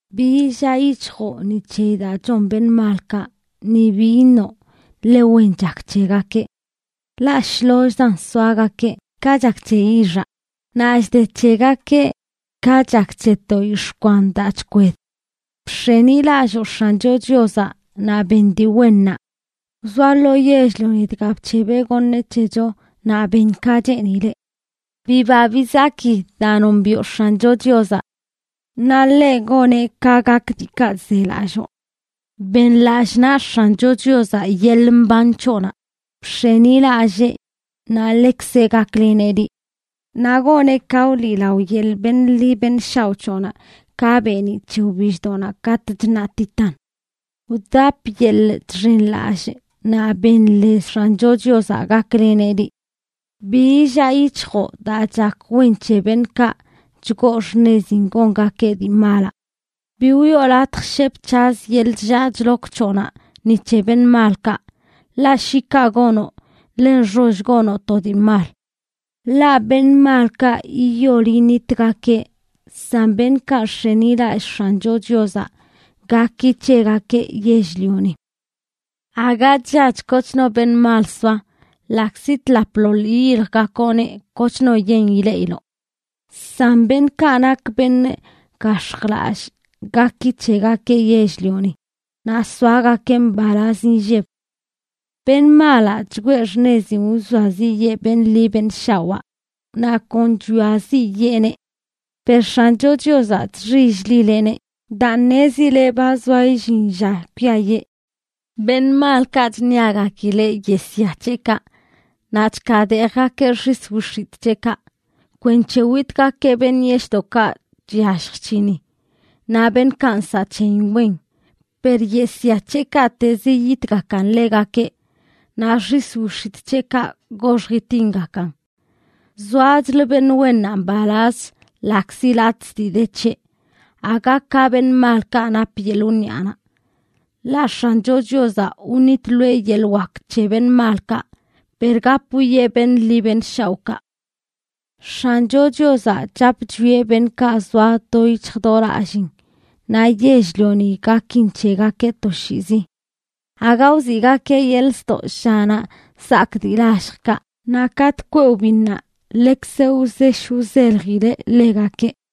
Bi illaa yic̱hjoꞌ ni c̱heyi daa chon beṉꞌ malkaꞌ, ni bi iṉoꞌ ḻe wen chak c̱hegakeꞌ. Ḻaꞌ shlollzan soagakeꞌ, ka chak c̱he yixaꞌ, naꞌ chde c̱hegakeꞌ ka chak c̱he to yix̱ꞌ kwan daa chkwed. Bx̱enilalloo X̱ancho Chiozaꞌ naꞌ ben dii wennaꞌ. Wzoa lo yell-lioni dga bc̱hebeꞌ goṉeꞌ c̱hecho naꞌ ben ka cheenileꞌ. Biba bizaki daa nombiꞌo X̱ancho Chiozaꞌ, naꞌ ḻeꞌ goneꞌ ka gak diikaꞌ zelalloo. Ben lallꞌ naꞌ X̱ancho Chiozaꞌ yeḻꞌ mban c̱hoꞌnaꞌ. Bx̱enilallee, naꞌ ḻeꞌkzeꞌ gakleneꞌ liꞌ. Naꞌ goneꞌ ka wliꞌlao yeḻꞌ beṉꞌ ḻi beṉꞌ shaoꞌ c̱hoꞌnaꞌ ka beeniꞌ c̱he wbilldoꞌnaꞌ katꞌ chṉaꞌtitan. Wdap yeḻꞌ chxenlallꞌ naꞌ ben lez X̱ancho Chiozaꞌ gakleneꞌ liꞌ. Bi illaa yic̱hjoꞌ daa chak wen c̱he beṉꞌkaꞌ chgoo xṉezin gongakeꞌ dii malaꞌ. Bi wiꞌo latj shep c̱haz yeḻꞌ chllaa chlok c̱hoꞌnaꞌ ni c̱he beṉꞌ malkaꞌ, ḻaꞌ shi kaꞌ gonoꞌ, ḻe nxoll gonoꞌ to dii mal. Ḻaꞌ beṉꞌ malkaꞌ yiyol yinitgakeꞌ, san beṉꞌkaꞌ nx̱enilallꞌ X̱ancho Chiozaꞌ gaki c̱hegakeꞌ yell-lioni. Aga chllach kochno beṉꞌ mal soa; ḻaꞌkzi tlapḻoḻ yiyiljgakoꞌneꞌ, kochno yen ileꞌiloꞌ. San beṉꞌkaꞌ nak beṉꞌ gax̱jlallꞌ gaki c̱hegakeꞌ yell-lioni, naꞌ soagakeꞌ mbalaz inlleb. Beṉꞌ malaꞌ chgwee xṉezin wzoaziꞌyee beṉꞌ ḻi beṉꞌ shawaa, naꞌ kon chwiaziꞌyeeneꞌ. Per X̱ancho Chiozaꞌ chxill-lileꞌneꞌ daa ṉezileꞌ ba zoa illin lla kwiayee. Beṉꞌ malkaꞌ chṉiagakileꞌ yesya c̱heꞌkaꞌ naꞌ chkaadeejgakeꞌ xis wix̱itꞌ c̱heꞌkaꞌ kwenc̱he witgakeꞌ beṉꞌ yeshꞌdoꞌkaꞌ chyallj chc̱hini, naꞌ beṉꞌkaꞌ nsaꞌ c̱heyin wen. Per yesya c̱heꞌkaꞌtezə yiyitgakan ḻegakeꞌ, naꞌ xis wix̱itꞌ c̱heꞌkaꞌ goxj itingakan. Zoachlə beṉꞌ wennaꞌ mbalazch ḻaꞌkzi latꞌzə dii de c̱heꞌ, aga ka beṉꞌ malkaꞌ nap yeḻꞌ wniꞌanaꞌ. Ḻaꞌ X̱ancho Chiozaꞌ wṉitloeꞌ yeḻꞌ wak c̱he beṉꞌ malkaꞌ, per gap wwieꞌ beṉꞌ ḻi beṉꞌ shaoꞌkaꞌ. X̱ancho Chiozaꞌ chap chwieꞌ beṉꞌkaꞌ zoa do yic̱hj do lallin, naꞌ yell-lioni gakin c̱hegakeꞌ toshiizi. Aga wziꞌgakeꞌ yeḻꞌ ztoꞌ llanaꞌ zaak dii lalljkaꞌ, naꞌ katꞌ kweꞌ wbinnaꞌ, ḻekzeꞌ wzesh wzeljileꞌ ḻegakeꞌ.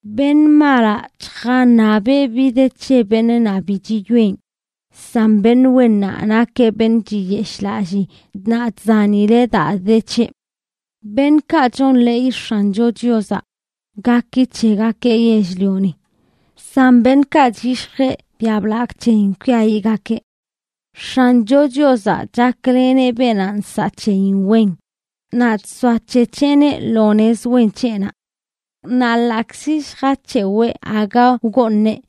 Beṉꞌ malaꞌ chjaṉabeꞌ bi de c̱he beṉꞌ naꞌ bi chiyoꞌen; san beṉꞌ wennaꞌ nakeꞌ beṉꞌ chiyeshꞌlallii naꞌ chzanileꞌ daa de c̱heꞌ. Beṉꞌkaꞌ chonḻeey X̱ancho Chiozaꞌ, gaki c̱hegakeꞌ yell-lioni; san beṉꞌkaꞌ chyishjeꞌ biaꞌ blagꞌ c̱heyin, kwiayiꞌgakeꞌ. X̱ancho Chiozaꞌ chakleneꞌ beenaꞌ nsaꞌ c̱heyin wen, naꞌ chzoac̱hec̱heꞌneꞌ lo nez wen c̱heꞌnaꞌ. Naꞌ ḻaꞌkzi lljac̱hewee aga wgooṉeꞌ,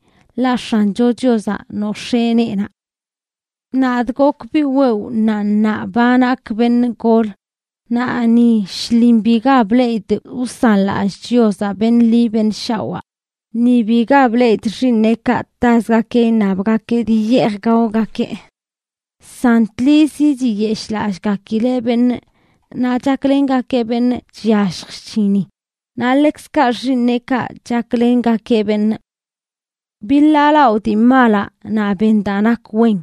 ḻaꞌ X̱ancho Chiozaꞌ nox̱ee neenaꞌ. Nadꞌ gok biꞌ wewꞌ naꞌ ṉaa ba nak beṉꞌ gol, naꞌ ni shlin biga bleꞌidꞌ wsanlallꞌ Chiozaꞌ beṉꞌ ḻi beṉꞌ shawaa, ni biga bleꞌidꞌ xiiṉeꞌkaꞌ tazgakeꞌ iṉabgakeꞌ dii yeej gaogakeꞌ. San tlizi chiyeshꞌlallꞌgakileꞌ beṉꞌ, naꞌ chaklengakeꞌ beṉꞌ chyallj chc̱hini; naꞌ ḻekzkaꞌ xiiṉeꞌkaꞌ chaklengakeꞌ beṉꞌ. Biḻaalaꞌo dii malaꞌ naꞌ ben daa nak wen,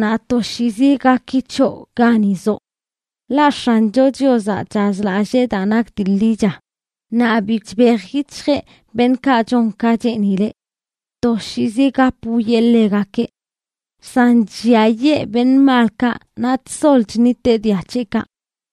naꞌ toshiizi gaki c̱hoꞌ gani zoꞌ. Ḻaꞌ X̱ancho Chiozaꞌ chazlallee daa nak dii ḻicha, naꞌ bi chbej yic̱hjeꞌ beṉꞌkaꞌ chon ka cheenileꞌ. Toshiizi gap wwieꞌ ḻegakeꞌ. San chlliayee beṉꞌ malkaꞌ, naꞌ chsol chṉiteꞌ dia c̱heꞌkaꞌ.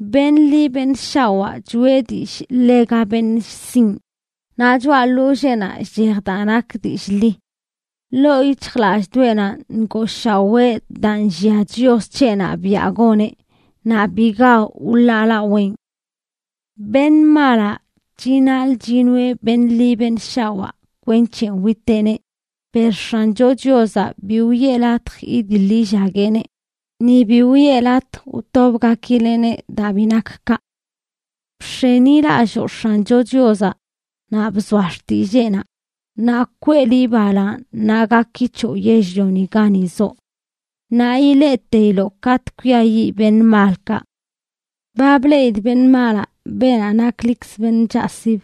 Beṉꞌ ḻi benꞌ shawaa choꞌe dillꞌ ḻega beṉꞌ sinꞌ, naꞌ choꞌa ḻolleenaꞌ chchej daa nak dillꞌ ḻi. Ḻoo yic̱hjlallꞌdoꞌenaꞌ ngooshawee daa nllia Chios c̱heꞌnaꞌ biaꞌ goneꞌ, naꞌ biga wḻaalaween. Beṉꞌ malaꞌ chinaḻꞌ chinoeꞌ beṉꞌ ḻi beṉꞌ shawaa kwenc̱he witeꞌneꞌ; per X̱ancho Chiozaꞌ bi wiꞌe latj idiḻ illagueꞌneꞌ, ni bi wiꞌe latj wtobgakileꞌneꞌ daa bi nak kaꞌ. Bx̱enilalloo X̱ancho Chiozaꞌ, naꞌ bzoa xtilleenaꞌ, naꞌ kwee liꞌ balaaṉ naꞌ gaki c̱hoꞌ yell-lioni gani zoꞌ. Naꞌ ileꞌteiloꞌ katꞌ kwiayiꞌ beṉꞌ malkaꞌ. Ba bleꞌidꞌ beṉꞌ malaꞌ, beenaꞌ naklikzə beṉꞌ chaꞌsib,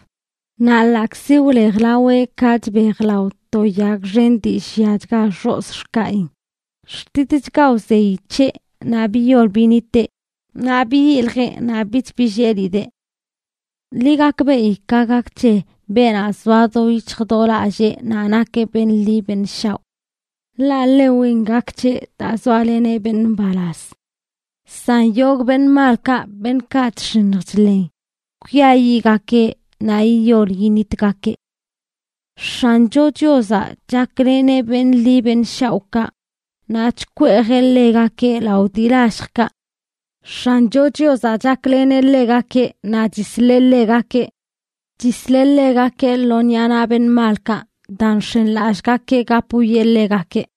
naꞌ ḻaꞌkzi wlejlaweꞌ ka chbejlao to yag xen dii lliachga xozꞌ xkaꞌin, xtitchga wzeyi c̱heꞌ naꞌ biyol biniteꞌ; naꞌ biyiljee, naꞌ bich billelidee. Ḻi gakbeꞌi ka gak c̱he beenaꞌ zoa do yic̱hj do lallee naꞌ nakeꞌ beṉꞌ ḻi beṉꞌ shaoꞌ, ḻaꞌ ḻe wen gak c̱heꞌ daa zoaleneꞌ beṉꞌ mbalaz. San yogꞌ beṉꞌ malkaꞌ, beṉꞌkaꞌ chx̱iṉj chḻen, kwiayiꞌgakeꞌ naꞌ yiyol yinitgakeꞌ. X̱ancho Chiozaꞌ chakleneꞌ beṉꞌ ḻi beṉꞌ shaoꞌkaꞌ, naꞌ chkweejeꞌ ḻegakeꞌ lao dii lalljkaꞌ. X̱ancho Chiozaꞌ chakleneꞌ ḻegakeꞌ naꞌ chisleꞌ ḻegakeꞌ. Chisleꞌ ḻegakeꞌ lo ṉiꞌa naꞌ beṉꞌ malkaꞌ daa nx̱enlallꞌgakeꞌ gap wwieꞌ ḻegakeꞌ.